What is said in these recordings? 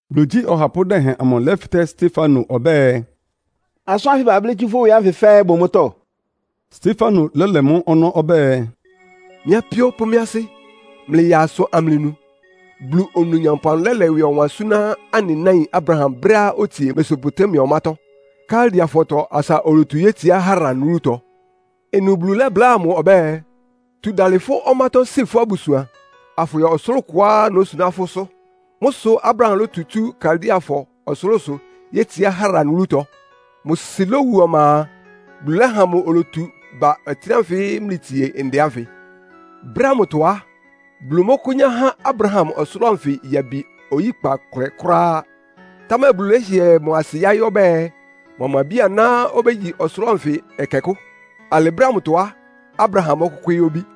Bulu igyí ɔhapʋ́ dɛhɛn amʋ lɛ́fɩtɛ́ Stefano ɔbɛ́ɛ, “Asʋ́n ánfɩ bablɩ́ tsú fʋ́ ɩwɩ ánfɩ fɛ́ɛ́ bʋ mʋ́tɔ́?” Stefano lɛ́lɛ mʋ́ ɔnɔ́ ɔbɛ́ɛ, “Mɩ́ apíó pʋ́ mɩ́ asɩ́, mlɩyaa asʋ amlɩnu! Bulu Onumnyampʋ amʋ lɛ́lɛ ɩwɩ ɔwan súná anɩ náin Abraham brɛ́á otsie Mesopotamia ɔmátɔ́, Kaldeafɔtɔ asa olotu yétsiá Haran wúlutɔ. Ɩnʋ Bulu lɛ́bláa mʋ ɔbɛ́ɛ, ‘Tu dalɩ fʋ́ ɔmátɔ́ si fʋ́ abusuan, afʋyɔ ɔsʋlʋ́ʋ kʋá nósuná fʋ́sʋ́.’ Mʋ́ sʋ Abraham lótu tsú Kaldeafɔ ɔsʋlʋ́sʋ yétsiá Haran wúlutɔ. Mʋ sɩ lowu ɔma a, Bulu lɛ́ha mʋ olotu ba ɔtɩ́nɛ́ ánfɩ mlɩtsie ndɛ ánfɩ. Brɛ́ ámʋtɔ á, Bulu mɔ́kʋ́nyá há Abraham ɔsʋlʋ́ʋ anfɩ yabi oyíkpa kʋlɛ kʋ́ráá. Támɛ Bulu lɛ́hɩɛ mʋ asɩ yaɩ́ ɔbɛ́ɛ, mʋa mʋ abí-aná obégyi ɔsʋlʋ́ʋ anfɩ ɛkɛkʋ́. Alɩ brɛ́ ámʋtɔ á, Abraham mɔ́kʋ́kwɩ́ɩ́ obí.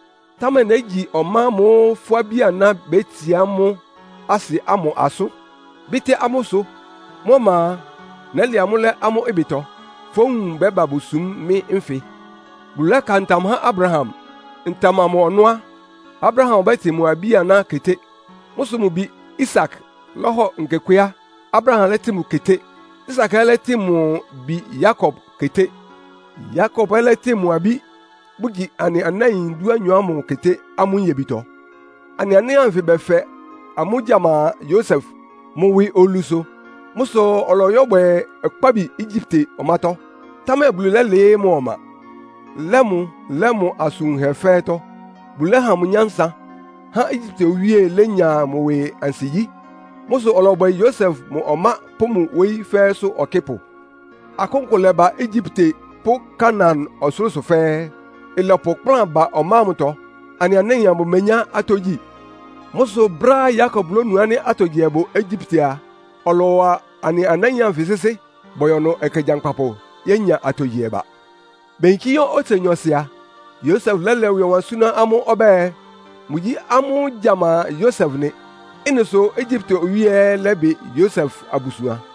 Támɛ négyi ɔmá ámʋ́ʋ́ fʋ́ abí-aná béyetsiá amʋ́ asɩ ámʋ asʋ́n, bɩ́tɩ́ amʋ́ ɩsʋ. Mʋ́ ɔma a, nɛ́lɛ amʋ́ lɛ́ amʋ́ ɩbɩtɔ, fówun bɛ́ba bosúm mɩ́ nfɩ.’ Bulu lɛ́ka ntam há Abraham. Ntam amʋ ɔnɔ́ á, Abraham ɔbɛ́tɩn mʋ abí-aná keté. Mʋ́ sʋ mʋ bi Isak lɔ́hɔ nkekwé á, Abraham lɛ́tɩn mʋ keté. Isak ɛ́ lɛ́tɩn mʋ bi Yakob keté. Yakob ɛ́ lɛ́tɩn mʋ abí, bʋgyi anɩ anáin dúanyɔ ámʋ keté amʋ́ nyebitɔ. “Anɩ anáin anfɩ bɛfɛ amʋ́ gyama Yosef, mʋ ɩwɩ olu sʋ. Mʋ́ sʋ ɔlɔyɔ yɛ́bwɛ ɔkpábi Egyipte ɔmátɔ́. Támɛ Bulu lɛ́lɩɩ́ mʋ ɔma, lɛ́ mʋ lɛ́ mʋ asʋn wunhɛ fɛ́ɛ́tɔ́. Bulu lɛ́ha mʋ nyánsa, há Egyipte owíe lénya mʋ ɩwɩ ansigyí. Mʋ́ sʋ ɔlɔbwɛ Yosef mʋ ɔmá pʋ́ mʋ wóyí fɛ́ɛ́sʋ́ ɔkɩ́pʋ. Akʋ́n kʋ lɛ́bá Egyipte pʋ́ Kanaan ɔsʋlʋ́sʋ fɛ́ɛ́. Ɩlɔpʋ ɩkplán ba ɔmá ámʋtɔ. Anɩ anáin amʋ bʋmenyá atɔ́ gyi. Mʋ́ sʋ brɛ́á Yakob lónu ánɩ́ atogyihɛ bʋ Egyipte a, ɔlɔwa anɩ anáin anfɩ sɩ́sɩ́. Bɔyɔ ɩnʋ ɛkɛ gyankpapʋ yénya atogyihɛ ba. Beyinkí yɔ́ otse nyɔɔsɩ a, Yosef lɛ́lɛ ɩwɩ ɔwan súná amʋ́ ɔbɛ́ɛ, mʋgyí amʋ́ gyama Yosef nɩ. Ɩ́nɩ sʋ Egyipte owíe ɛ́ lɛ́bɩ Yosef abusuan.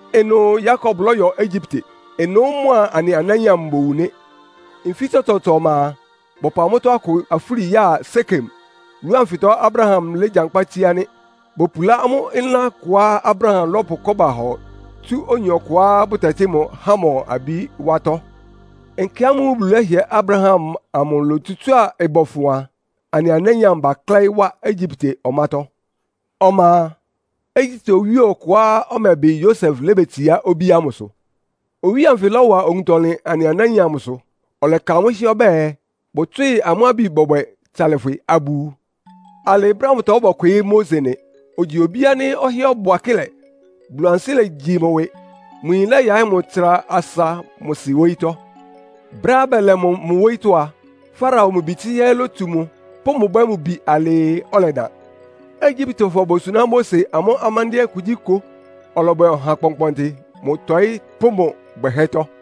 Ɩnʋ Yakob lɔ́yɔ Egyipte. Ɩnʋ́ mʋa anɩ anáin amʋ bowu nɩ́. Nfí tsɔtsɔɔtsɔ ɔma a, bɔpʋ amʋ́tɔ́ akʋ afúli ya Sekem. Wúlu anfɩtɔ Abraham légyankpá tsíá nɩ́. Bopulá amʋ́ ɩlán kʋá Abraham lɔ́pʋ kɔ́ba hɔ tsu oyin ɔkʋá bʋtɛtɩ́ mʋ Hamor abí wátɔ́. “Nkɛ ámʋ́ʋ́ Bulu lɛ́hɩɛ Abraham amʋ lotsutsúa ɩbɔfʋn a, anɩ anáin amʋ baklɛ́ɩ́ wá Egyipte ɔmátɔ́. Ɔma a, Egyipte owíe ɔkʋá ɔmɛbɩ Yosef lébetsiá obíá ámʋsʋ. Owíe anfɩ lɔ́wa owuntɔlɩn anɩ anáin amʋsʋ. Ɔlɛka amʋ́ hɩ́ɛ́ ɔbɛ́ɛ, bʋtswɩ́ɩ amʋ́ abi bɔbwɛ tsalɩfwɩ abʋwu. Alɩ brɛ́ ámʋtɔ bɔkwɩɩ́ Mose nɩ. Ogyi obí ánɩ́ ɔhɩ́ɛ́ ɔbʋ akɩ́lɛ, Bulu ansɩ́ legyi mʋ ɩwɩ. Mʋ yin lɛ́yaɩ́ mʋ tsra asa mʋ sɩ wóyítɔ́. Brɛ́á bɛlɛ mʋ mʋ wóyítɔ́ a, Farao mʋ bi tsɩ́hɛ́ lótsu mʋ, pʋ́ mʋ bwɛ́ mʋ bi alɩɩ, ɔlɛdan. Egyiptefɔ bosuná Mose amʋ́ amándɩ́ɛ́ kugyíkʋ. Ɔlɔbwɛ ɔha kpɔnkpɔntɩ mʋ ɩtɔ́ɩ pʋ́ mʋ bwɛhɛ́tɔ́.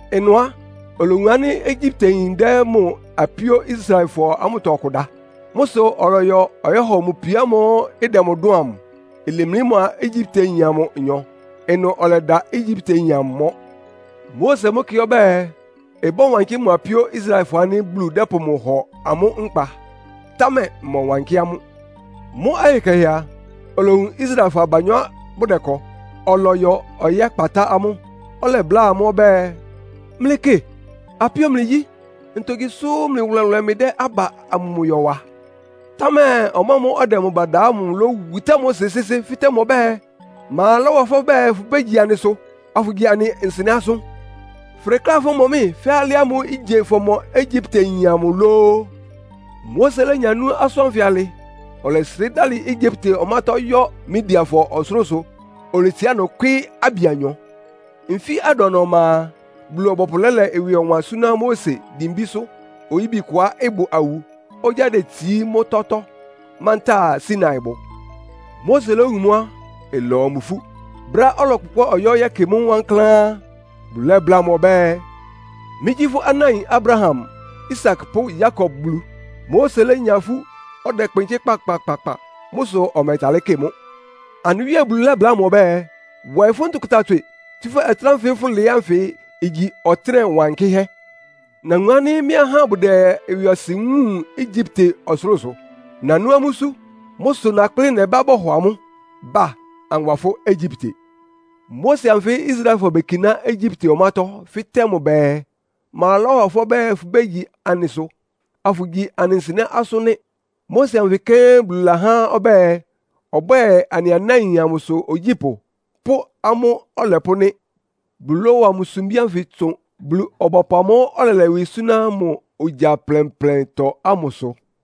Ɩnʋ á, olowun ánɩ́ Egyipteyin dɛ́ mʋ apíó Israelfɔ ámʋtɔ ɔkʋ da. Mʋ́ sʋ ɔlɔyɔ ɔyɔ́hɔ mʋ pio ámʋ́ʋ́ ɩdɛ mʋ dʋ́ʋn amʋ, ilemlí mʋa Egyipteyin amʋ nyɔ. Ɩnʋ ɔlɛda Egyipteyin ámʋ mɔ́. Mose mʋ́ kɩ ɔbɛ́ɛ, ɩbɔ́wankɩ́ mʋ apíó Israelfɔ ánɩ́ Bulu dɛ́pʋ mʋ hɔ amʋ́ nkpa, támɛ ɩmɔwankɩ́ amʋ́. Mʋ́ ɔyɩ kɛhɛ a, olowun Israelfɔ abanyɔ́ bʋdɛkɔ. Ɔlɔyɔ ɔyɛ́kpatá amʋ́, ɔlɛbláa amʋ́ ɔbɛ́ɛ, ‘Mlɩkɩ, apíó mlɩgyí. Ntogyi sʋ́ mlɩ wʋlɛwʋlɛ mlɩdɛ́ aba amʋmʋyɔ wa?’ Támɛ ɔmʋamʋ́ʋ́ ɔdɛ mʋ ba da ámʋ lówutá Mose sɩ́sɩ́, fɩ́tɛ́ mʋ ɔbɛ́ɛ, ‘Ma lɔ́wa fʋ́ ɔbɛ́ɛ fʋbégyi anɩsʋ, afʋgyi anɩ nsɩnɛ́ asʋ́n? Fʋdekléá fɔ́mɔ mɩ́, fɛ́ alɩ ámʋ́ʋ́ ígye fɔmɔ Egyipteyin amʋ lóó?’ Mose lénya nú asʋ́n ánfɩ alɩ, ɔlɛsrɩ́ dalɩ Egyipte ɔmátɔ́ yɔ́ Midiafɔ ɔsʋlʋ́sʋ. Oletsiá ɩnʋ kwɩ́ɩ́ abi anyɔ. “Nfí adʋana ɔma a, Bulu-ɔbɔpʋ lɛ́lɛ ɩwɩ ɔwan súná Mose dimbísʋ́ oyíbi kʋá ɩbʋ awu, ogyá detsií mʋ́tɔ́tɔ́, mantáa Sinaibʋ. Mose lówun mʋ́ á, ɩlɔwa mʋ ifú. Brɛ́á ɔlɔkpʋkpɛ́ ɔyɔ́ yɛ́kɩ mʋ́ wankláán á, Bulu lɛ́bláa mʋ ɔbɛ́ɛ, ‘Mɩ́gyí fʋ́ anáin Abraham, Isak pʋ́ Yakob Bulu.’ Mose lénya ifú, ɔdɛkpɩnkɩ́ kpakpakpakpa. Mʋ́ sʋ ɔmɛtalɩ́ kɩ mʋ́. Anɩ Wíe Bulu lɛ́bláa mʋ ɔbɛ́ɛ, ‘Wɔɩ fʋ́ ntʋkʋta tswɩ, tsúfɛ́ ɔtɩ́nɛ́ ánfɩ fʋlɩɩ́ ánfɩ igyi ɔtɩnɛ wankɩ́hɛ́. Nawun ánɩ́ mɩ́ ahá bʋdɛ ɩwɩɔsɩn wúun Egyipte ɔsʋlʋ́sʋ. Nanú amʋ́ isú. Mʋ́ sʋ nakplɩ́ nɛbá bɔhɔ amʋ́. Ba, anwa fʋ́ Egyipte.’ “Mose anfɩ́ Israelfɔ bekiná Egyipte ɔmátɔ́, fɩ́tɛ́ mʋ bɛɛ, ‘Ma lɔ́wa fʋ́ ɔbɛ́ɛ fʋbégyi anɩsʋ, afʋgyi anɩ nsɩnɛ́ asʋ́n?’ nɩ́. Mose anfɩ kɛ́n Bulu lɛ́ha ɔbɛ́ɛ, ɔbwɛ́ɛ anɩ anáin amʋ́sʋ́ ogyípʋ́ pʋ́ amʋ́ ɔlɛpʋ́ nɩ́. Bulu lɔ́wa mʋ sumbí ánfɩ tsʋn Bulu-ɔbɔpʋ amʋ́ʋ́ ɔlɛlɛ ɩwɩ súná mʋ ogya plɛnplɛntɔ ámʋsʋ.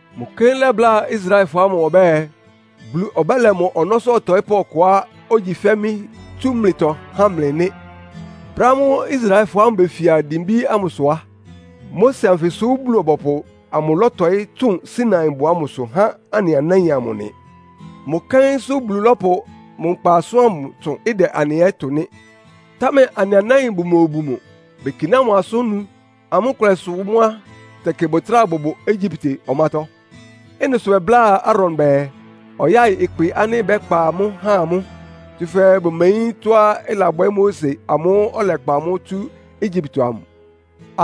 Mʋ kɛ́n lɛ́bláa Israelfɔ ámʋ ɔbɛ́ɛ, ‘Bulu ɔbɛ́lɛ mʋ ɔnɔ́sʋ́ ɔtɔɩ́pʋ́ ɔkʋá ogyi fɛ́ mɩ́ tsú mlɩtɔ há mlɩ’ nɩ́. Brɛ́á mʋa Israelfɔ ámʋ befia dimbí ámʋsʋ á, Mose anfɩsʋ Bulu-ɔbɔpʋ amʋ lɔ́tɔɩ́ tsʋn Sinaibʋ ámʋsʋ há anɩ anáin amʋ nɩ. Mʋ kɛ́nsʋ́ Bulu lɔ́pʋ mʋ nkpa asʋ́n ámʋ tsʋn, ɩdɛ anɩ ɛ́ tʋ nɩ́. “Támɛ anɩ anáin bʋmobu mʋ. Bekiná mʋ asʋ́n nu. Amʋ́ nkʋlɛ sʋ mʋ́ á, tɛkɩ bʋtráa bʋbʋ Egyipte ɔmátɔ́. Ɩ́nɩ sʋ bɛbláa Aaron bɛɛ, ɔyáɩ ɩkpɩ ánɩ́ bɛ́kpa amʋ́ ha amʋ́. Tsúfɛ́ bʋmeyín tɔ́á ɩlabwɛ́ Mose amʋ́ʋ́ ɔlɛkpa amʋ́ tsú Egyipte amʋ.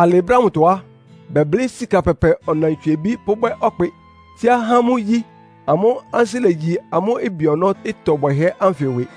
Alɩ brɛ́ ámʋtɔ á, bɛblɩ́ sika pɛpɛ ɔnantswiebí pʋ́bwɛ́ ɔkpɩ, tsíá há mʋ́ igyí. Amʋ́ ansɩ́ legyi amʋ́ ɩbɩ ɔnɔ́ ɩtɔ bwɛhɛ́ ánfɩ ɩwɩ.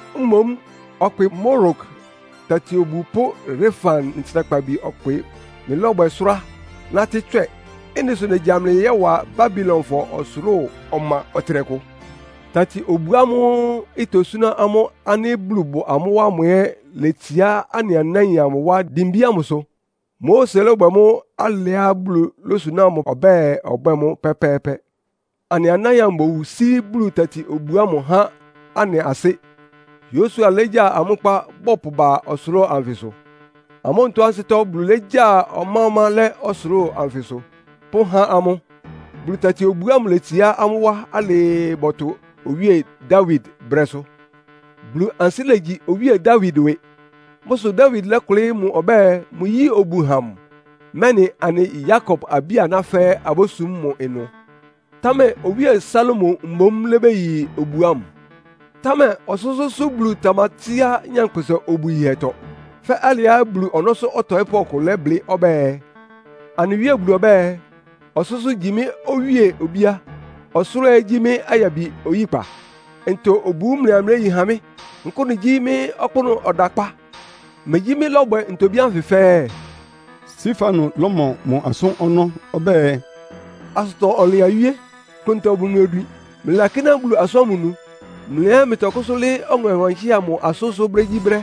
Mboún ɔkpɩ Molok tati-obu pʋ́ Refan ntsrakpabi ɔkpɩ mlɩlɔ́bwɛ sʋ́rá, nátɩ́ tswɛ. Ɩ́nɩ sʋ négya mlɩ yɔ́wa Babilonfɔ ɔsʋlʋ́ʋ ɔma ɔtɩnɛkʋ.’ “Tati-obu ámʋ́ʋ́ itosúná amʋ́ ánɩ́ Bulu bʋ amʋ́ wá ámʋ ɛ́ letsiá anɩ anáin amʋ wá dimbí ámʋsʋ. Mose lɔ́bwɛ mʋ́ alɩá Bulu lósuná mʋ ɔbɛ́ɛ, ɔbwɛ́ɛ mʋ́ pɛ́pɛ́ɛ́pɛ́. Anɩ anáin amʋ bowu sí Bulu tati-obu ámʋ há anɩ asɩ́, Yosua légya amʋ́ nkpá bɔpʋba ɔsʋlʋ́ʋ anfɩsʋ. Amʋ́ onutó ansɩ́tɔ́ Bulu légya ɔmá-ɔmá lɛ́ ɔsʋlʋ́ʋ anfɩsʋ pʋ́há amʋ́. Bulu tati-obu ámʋ letsiá amʋ́ wá alɩɩ bɔtʋ Owíe Dawid brɛ́sʋ́. Bulu ansɩ́ legyi Owíe Dawid ɩwɩ. Mʋ́ sʋ Dawid lɔ́kʋlɩ́ mʋ ɔbɛ́ɛ, mʋyíi obu ha mʋ, mɛ́nɩ anɩ Yakob abí-aná fɛ́ɛ́ abósum mʋ ɩnʋ. Támɛ Owíe Salomo mboún lébeyi obu ámʋ. “Támɛ Ɔsʋ́sʋ́ʋ́sʋ́ Bulu tamatsíá nyankpʋsa obu yihɛtɔ. Fɛ́ alɩá Bulu ɔnɔ́sʋ́ ɔtɔɩ́pʋ́ ɔkʋ lɛ́blɩ́ ɔbɛ́ɛ, ‘Anɩ Wíe Bulu ɔbɛ́ɛ, “Ɔsʋ́sʋ́ gyí mɩ́ owíe obíá, ɔsʋlʋ́ʋ ɛ́ igyi mɩ́ ayabi oyíkpa. Ntɔ obu mlɩaa mléyi ha mɩ́? Nkʋ́nʋ gyí mɩ́ ɔkpʋ́nʋ́ ɔdakpá? Megyí mɩ́ lɔ́bwɛ ntobí ánfɩ fɛ́ɛ́?”’” Stefano lɔ́mɔ mʋ asʋ́n ɔnɔ́ ɔbɛ́ɛ, “Asʋtɔ-ɔnlɩn awíé, klʋntɔ bʋ mlɩ odwin. Mlɩlakíná Bulu asʋ́n ámʋ nu. Mlɩ ɛ́ mlɩtɔkʋ́sʋ́ lɩ́ɩ́ Ɔŋɛ Wankɩ́hɛ́ amʋ asʋ́nsʋ́ brégyíbrɛ́,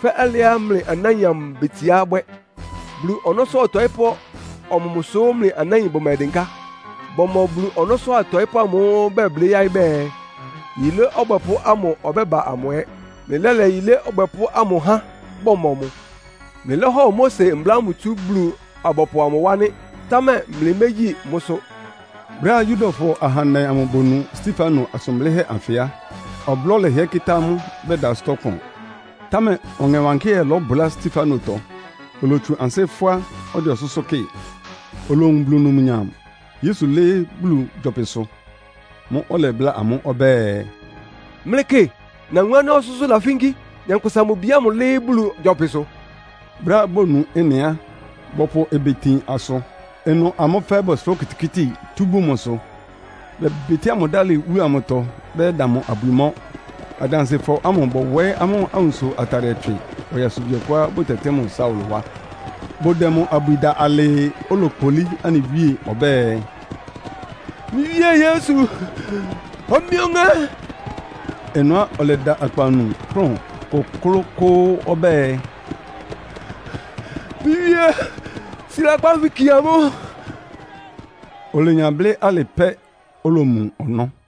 fɛ́ alɩá mlɩ anáin amʋ betsiá bwɛ́. Bulu ɔnɔ́sʋ́ ɔtɔɩ́pʋ́ ɔmɔmʋsʋ́ mlɩ anáin bʋmɛdɩnká? Bɔmɔ Bulu ɔnɔ́sʋ́ atɔɩ́pʋ́ amʋ́ʋ́ bɛblɩ́ yáɩ́ bɛɛ, Yilé Ɔbwɛpʋ́ ámʋ ɔbɛ́ba amʋ ɛ́. Mlɩlɛ́lɛ Yilé Ɔbwɛpʋ́ ámʋ há, bɔmɔ mʋ. Mlɩlɔ́hɔ Mose mbla ámʋ tsú Bulu-abɔpʋ ámʋ wá nɩ́, támɛ mlɩmégyi mʋ́sʋ́.” Brɛ́á Yudafɔ ahandɛ amʋ bonu Stefano asʋn blɩ́hɛ́ anfɩ á, ɔblɔ́ lɛhɩɛ kɩ́tá amʋ́, bɛda ansɩ́tɔ́ kpʋn. Támɛ Ɔŋɛ Wankɩ́hɛ́ lɔ́bʋlá Stefanotɔ, olotsu ansɩ́ fʋ́á, ɔdɛ ɔsʋ́sʋ́ kɩ́ɩ. Olowun Bulu numnyam, Yesu lɩ́ɩ́ Bulu gyɔpɩsʋ. Mʋ́ʋ́ ɔlɛbláa amʋ́ ɔbɛ́ɛ, “Mlɩkɩ, nawun ánɩ́ ɔsʋ́sʋ́ lafínkí, Nyankpʋsa-Mʋ-Bi ámʋ lɩ́ɩ́ Bulu gyɔpɩsʋ.” Brɛ́á bonu ɩ́nɩ á, bɔpʋ ɩbɩ tin asʋ. Ɩnʋ amʋ́ fɛ́ɛ́ bɔsʋrá okitikíti tú bun mʋsʋ, bɛbɩtɩ́a mʋ dalɩ wúlu amʋtɔ bɛyɛ́da mʋ abwi mɔ́. Adansɩfɔ ámʋ bɔwɔɩ́ amʋ́ awunso atadɩɛ tswɩ ɔyasubi ɔkʋá bʋtɛtɩ́ mʋ Saulo wá. Bʋdɛ mʋ abwi da alɩɩ, olokpolí anɩ Wíe ɔbɛ́ɛ, “Mɩ́ Wíe Yesu, hɔ mɩ́ ɔŋɛ́.” Ɩnʋ á, ɔlɛda akpawunu, kplʋ́n kʋklʋ́kʋ́ʋ́ ɔbɛ́ɛ, “Mɩ́ Wíe, si lakpan ánfɩ kie amʋ́.” Olenya blɩ́ alɩ pɛ́, olomu ɔnɔ́.